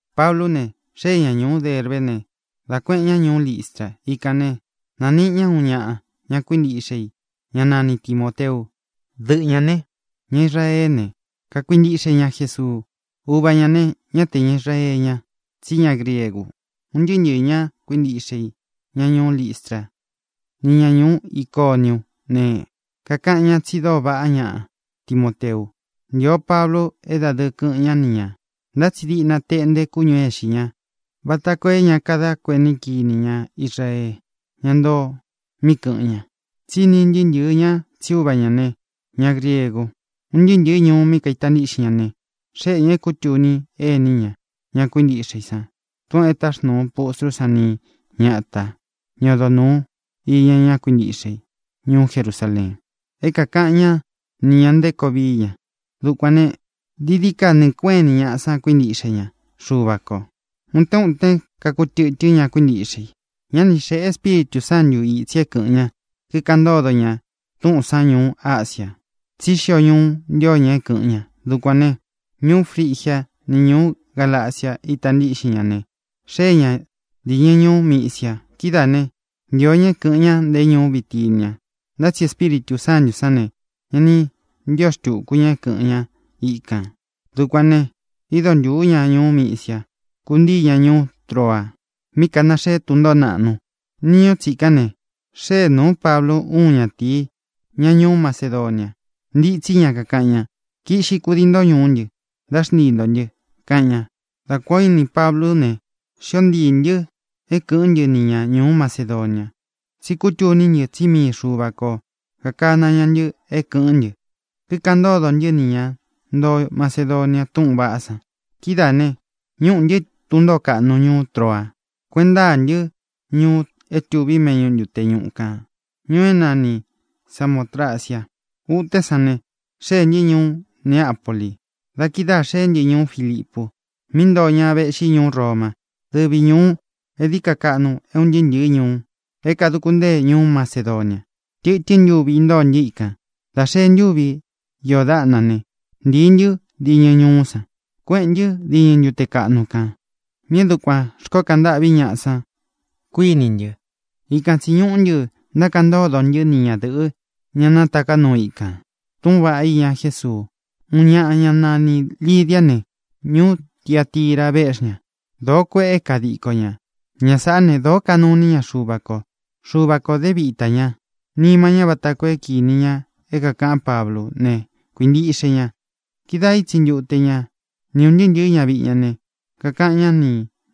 Pablú ne, xée ña ñūú Derbé ne, dá kuēꞌen ñá ñuú Listra. Ikān ne, nániꞌi ña uun ñaꞌa, ña kuíntiꞌxe i, ñá nani Timōteu. Dɨꞌɨ ñā ne, ña Israeé ne, kakuintiꞌxe ña Jesuu. Uva ñā ne, ñá te ña Israeé ña, tsí ña griegu. Un ntɨɨ́ ntɨ̄ɨ́ ña kuíntiꞌxe i, ña ñuú Listra, ni ña ñuú Iconiú ne, kakaꞌan ñá tsi dóo vaꞌá ñaꞌa Timoteu. Ntío Pablu é dadɨɨ kɨꞌɨn ñá ni ñā, ntá tsi diꞌna teꞌnte kúñū é ixi ñá vata koo é ña kadá kuení kini ña Israee, ñá ntoo mí kɨ̄ꞌɨn ña, tsí ini ntɨɨ́ ntɨɨ̄ ñá tsí uva ñā ne, ña griegu. Un ntɨɨ́ ntɨ̄ɨ́ ñuu mí kaita ntiꞌxin ñá ne, xéꞌe ñā é kūtuni ení ña, ña kuíntiꞌxe i san, túꞌūn e táxnūu pustrú san ni ñata, ña odo nūu iña ña kuíntiꞌxe i ñuú Jerusaleen, é kākaꞌan ñá ni ñā nté koo vií ña. Dukuān ne, dií dií ka nɨɨ̄ kueꞌén ini ñaꞌa san kuíntiꞌxe ña Xuva kō. Utén utén kakutɨtɨ́n ña kuíntiꞌxe i. Ña ni xéꞌe Espíritū Sántu ītsi é kɨ̄ꞌɨn ña, kikaꞌan ntódo ña túꞌūn san ñuú Asia, tsí xio ñuu ntío ña é kɨ̄ꞌɨn ña. Dukuān ne, ñuú Frigia ni ñuú Galacia ita ntíꞌxin ña ne, xée ña dīñɨ ñuú Misia. Kidáā ne, ntio ña é kɨ̄ꞌɨn ña nte ñuú Bitinia, ntá tsi Espíritū Sántū sán ne, ña ni ntío xtūku ña é kɨ̄ꞌɨn ñá ikān. Dukuān ne, ído ntūú ña ñuú Misia, kúntīí ña ñuú Troa, mí kanaxee tún ntōó naꞌnu. Niñu tsikán ne, xée nūú Pablu úun ñatīí, ña ñuú Macedonia. Ntitsí ña, kakaꞌan ña: “Kiꞌxi kudii nto ñuú ntɨ, dá xntii ntō ntɨ”, kaꞌan ña. Dá kuān o íni Pablú ne, xío ntiī ntɨ́ é kɨ̄ꞌɨ́n ntɨ ni ña ñūú Macedonia, tsí kútuní ntɨ tsí mii Xuva ko kākana ña ntɨ é kɨ̄ꞌɨ́n ntɨ, kikaꞌan ntódo ntɨ́ nī ña ntoo Macedonia túꞌūn vaꞌá san. Kidáā ne, ñúꞌū ntɨ́ tun ntōó kaꞌnu ñuú Troa, kueꞌen ntáa ntɨ́ ñuu é tuvi méꞌñu ntute ñuꞌu kān, ñuu é nani Samōtracia. Utén san ne, xéē ntɨ́ ñuú Neapoli. Da kidáā xeé ntɨ ñuú Filipu, mí ntoo ña véꞌxi ñuú Roma. Dɨvi ñūu é dií ka kaꞌnu é un ntɨɨ́ ntɨ̄ɨ́ ñuu é kāduku ntée ñuú Macedonia. Tɨtɨ́n ntuvi intóo ntɨ́ ikān. Dā xee ntúvi iō dáꞌna ne, ntīi ntɨ́ diñɨ ñuú san, kueꞌén ntɨ diñɨ ntute kaꞌnu kān mí é dukuān xkoó kaꞌan ntâꞌví ñaꞌa san, kuíni ntɨ. Ikan tsī ñuꞌú ntɨ, ntákaꞌan ntódo ntɨ́ ni ñadɨ̄ꞌɨ́, ña nátaká nuu ikān, túꞌūn vaꞌá iña Jésuu. Uun ñaꞌa, ñá nanī Lidiá ne, ñuú Tiatira véꞌxi ña. Doo kuéꞌe kadiko ña. Ña sāꞌá ne, dōó kanuu iní ña Xuva kō. Xuva kō dé vitā ñá nima ñá vata koo é kinī ña é kākaꞌán Pablú ne, kuīntiꞌxe ña. Kidáā ítsi ntuté ña ni ūn ntɨɨ́ ntɨ̄ɨ́ ñaviꞌi ña ne, kakaꞌan ñá nī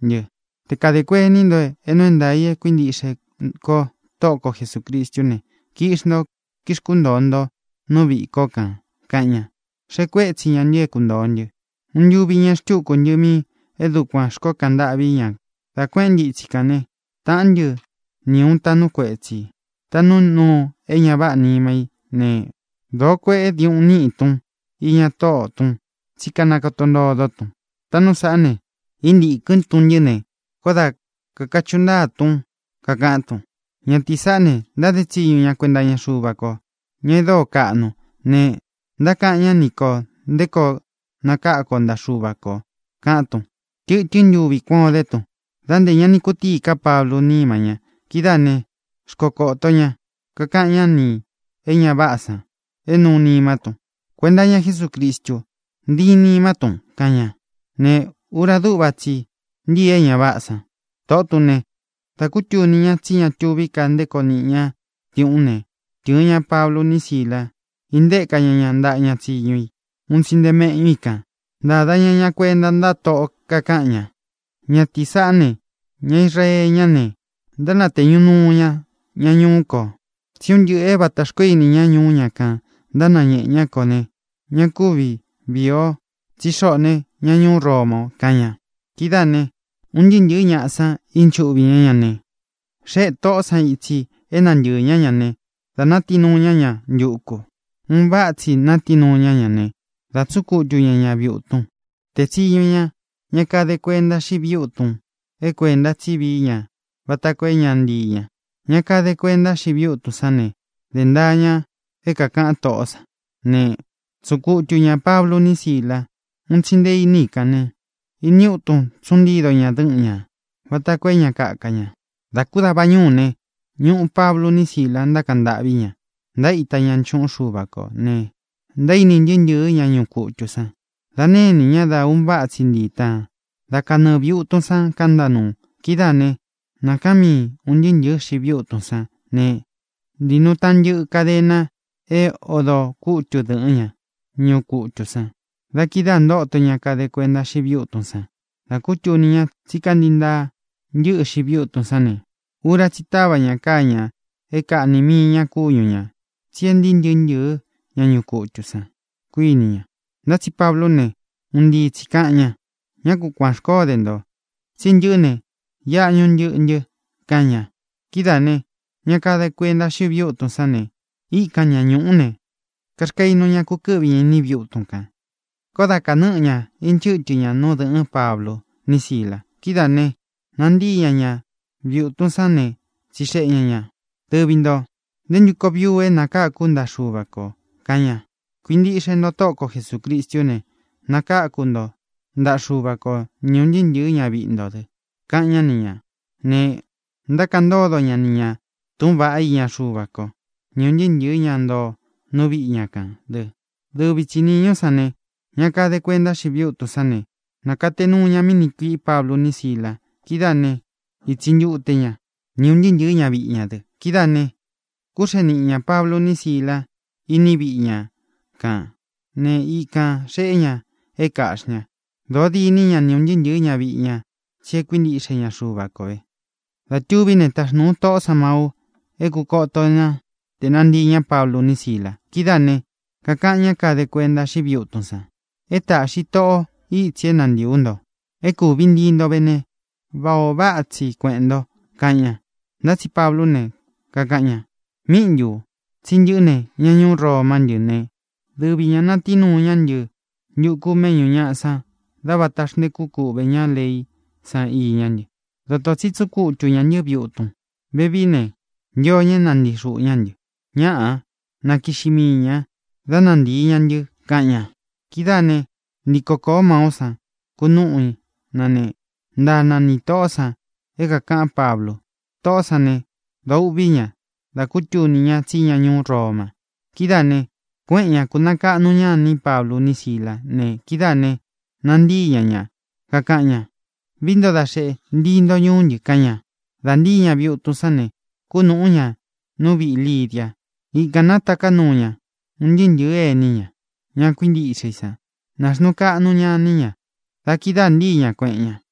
ntɨ: —Te kadē kuení nto é nuu é ntaā i e kuíntiꞌxe kó Tóꞌo ko Jesūcristú ne, kiꞌxi nto, kixkúntōo nto nú viꞌī kó kān —kaꞌan ña. Xēꞌe kuétsi ña ntɨ é kuntōo ntɨ. Uun ntuvi ñeꞌe xtúku ntɨ mí é dukuān xkoó kaꞌan ntâꞌví ña. Dá kuēꞌén ntɨ itsi kān né, tāꞌán ntɨ ni ūun taꞌnú kuetsī, taꞌnú nuu é ña váꞌā nima í ne, dōo kueꞌé diuꞌun niꞌí tun iña tóꞌō tún tsí kanakoto ntodó tun. Táꞌnu sāꞌá ne, íntīkɨ́n tun ntɨ́ ne, koó da kākachuꞌu ntáa tún, kakaꞌán tun: —Ñatīí saꞌá ne, ntáde tsiñu ña kuenta iña Xuva ko, ña e dóo kaꞌnu ne, ntákaꞌan ñá ni kō nté koo nakáku o ntaꞌa Xuva kō —kaꞌán tun. Tɨtɨ́n ntuvi kuan o dé tun, da nté ña ni kutíī ká Pablú nima ña. Kidáā né, xkokōto ña, kakaꞌan ñá nī é ña váꞌā san é nuu nimá tun: —Kuenta iña Jesúcristu, ntíin nimá tun —kaꞌan ña. Ne, ura dúꞌva tsi i ntíi é ña váꞌā san. Tōꞌó tun ne, dā kútuni ña tsí ña tuví ka nté koo niꞌi ñá diuꞌún ne, tɨ̄ɨn ña Pablu ni Sílā, íntēka ña ña ntaꞌa ña tsíñu i un tsi nte meꞌñú i kān. Ntāda ña ña kuenta ntáꞌa toꞌo, kakaꞌan ña: —Ñatīí saꞌá ne, ña Israee ñá ne, ntánatēñu nuu ña ña ñuú kō. Tsí un ntɨꞌɨ̄ é vatā xkoó ini ña ñuú ña kān ntánañēꞌe ñá kō ne, ña kúvi viī o, tsí xoꞌō ne, ña ñuú Roma o —kaꞌan ña. Kidáā ne, un ntɨɨ́ ntɨ̄ɨ́ ñaꞌa san ínchuꞌvi ñá ña ne, xéꞌe tōꞌó san itsi é nantɨɨ̄ ñá ña ne, dā natií nuu ña ña ntuku. Un váꞌa tsi natií nuu ña ñá ne, dā tsúꞌun kutu ña ñā viꞌi utun. Tēe tsiñu ña ña kade kuenta xíꞌi viꞌi útun é kuēnta tsí vií ña vata koo é ña ntii ña. Ña kade kuenta xíꞌi viꞌi útun sán ne, dē ntaa ña é kākaꞌan tóꞌó san ne, tsúꞌun kutu ñā Pablu ni Síla ūun tsi nte iní i kān ne, ini útun tsuꞌun ntido ña dɨ́ꞌɨn ña vata koo é ña kaka ña. Dā kú dava ñuú ne, ñuꞌu Pablu ni Sílā, ntákaꞌan ntâꞌví ña, ntaíta ña nchuꞌún Xuva kō ne, ntaíni ntɨɨ́ ntɨ̄ɨ́ ña ñuꞌu kutū san. Dā nénī ña dá un váꞌa tsi ntiī táan. Dá kanɨɨ̄ viꞌi utun san kantá nuu. Kidáā né, nākaan míi ūn ntɨɨ́ ntɨ̄ɨ́ xiꞌi viꞌi utun sán ne, ntīi nuu taꞌan ntɨꞌɨ kadena é odō kútu dɨ̄ꞌɨ́n ña ñuꞌu kutū san. Da kidáā ntóto ña kade kuenta xíꞌi viꞌi útun san. Dā kútuni ña tsí kantii ntaa ntɨ́ꞌɨ xiꞌi viꞌi útun sán ne, ura tsí i táva ña káa ñā é kāꞌni mii ña kúñu ñā, tsi é ntīí ntɨꞌɨ ña ñuꞌu kutū san, kuíni ña. Ntá tsi Pablú ne, un ntii tsī kaꞌan ña: —¡Ñá ku kuān xkoó de ntō! tsí ntɨꞌɨ́ ne, iꞌa ñuꞌu ntɨꞌɨ ntɨ —kaꞌan ña. Kidáā ne, ña kade kuenta xíꞌi viꞌi útun sán ne, íkan ña ñūꞌú ne, kaxkainu ña kukɨ́ꞌvi ña iní viꞌi utun kān. Koó da kānɨ́ꞌɨ ña inchɨ́tɨ ña nú dɨ̄ꞌɨ́n Pablu ni Sílā. Kidáā ne, nantíi ña ñā viꞌi utun sán ne, tsixeꞌe ña ñā: —Dɨvi ntō, ¿nté ntu koo vií u é nakáku ú ntaꞌa Xuva kō? —kaꞌan ña. —Kuintiꞌxe nto Tóꞌo ko Jesūcristú ne, nakaku ntó ntaꞌa Xuva ko, ni ūn ntɨɨ́ ntɨ̄ɨ́ ñaviꞌi nto dɨ —kaꞌan ñá ni ñā. Ne, ntákaꞌan ntódo ña ni ñā túꞌūn vaꞌá iña Xuva kó, ni ūn ntɨɨ́ ntɨ̄ɨ́ ña ntoo nú viꞌi ña kān dɨ. Dɨvi tsi nīñú san ne, ña kade kuenta xíꞌi viꞌi útun sán ne, nākate nuu ña mí niꞌi kuiꞌí Pablu ni Sílā. Kidáā né, ītsi ntute ña, ni ūn ntɨɨ́ ntɨ̄ɨ́ ñaviꞌi ña dɨ. Kidáā ne, kúxee niꞌi ñā Pablu ni Síla īní viꞌi ña kān né, ikān xeꞌé ña é kāꞌxi ña. Dōo dîní ña ni ūn ntɨɨ́ ntɨ̄ɨ́ ñaviꞌi ña tsi e kuíntiꞌxe ña Xuva ko vē. Dā tuví ne, táxnūu toꞌó san mau é kūkoto ná te nantīi ña Pablu ni Sílā. Kidáā ne, kākaꞌan ñá kade kuenta xíꞌi viꞌi útun san: —É tāꞌxi toꞌo ítsi é nantīi ú nto. É kūvi ntii nto ve ne, váꞌā o váꞌa tsi kuēꞌen nto —kaꞌan ña. Ntá tsi Pablú ne, kakaꞌan ña: —¿Míꞌi ntū? Tsi ntɨꞌɨ́ ne, ña ñuú Romá ntɨ ne, dɨvi ñā natií nuu ña ntɨ́ ntuku méꞌñū ñaꞌa san dá vāta xntekú kuꞌvē ñá leí san iñá ntɨ. Dotō tsi tsúꞌun kutu ñā ntɨ́ viꞌi utun. Vevií ne, ntio ña é nantii xuꞌū ñá ntɨ. ¡Ñáꞌā! Na kiꞌxi mii ñā, dá nantīi ña ntɨ —kaꞌan ña. Kidáā né, ntiko kōó maú san, kunúꞌu na ne, ntaa na ni tōꞌó san é kākaꞌán Pablu. Toꞌó san ne, dōo uꞌví ña da kútuni ña tsí ña ñuú Roma. Kidáā ne, kuéꞌen ña, kūnakaꞌnu ña iní Pablu ni Sílā ne, kidáā ne, nantíi ña ña, kakaꞌan ña: —Vií nto da xeꞌe, ntii nto ñuú ntɨ —kaꞌan ña. Dā ntíi ña viꞌi utun sán ne, kúnūꞌú ña nú viꞌī Lidia. Ikān nátaká nuu ña un ntɨɨ́ ntɨ̄ɨ́ ení ña, ña kuíntiꞌxe i sán ne, nāxnuu kaꞌnu ña iní ña. Da kidáā ntíi ña, kueꞌen ña.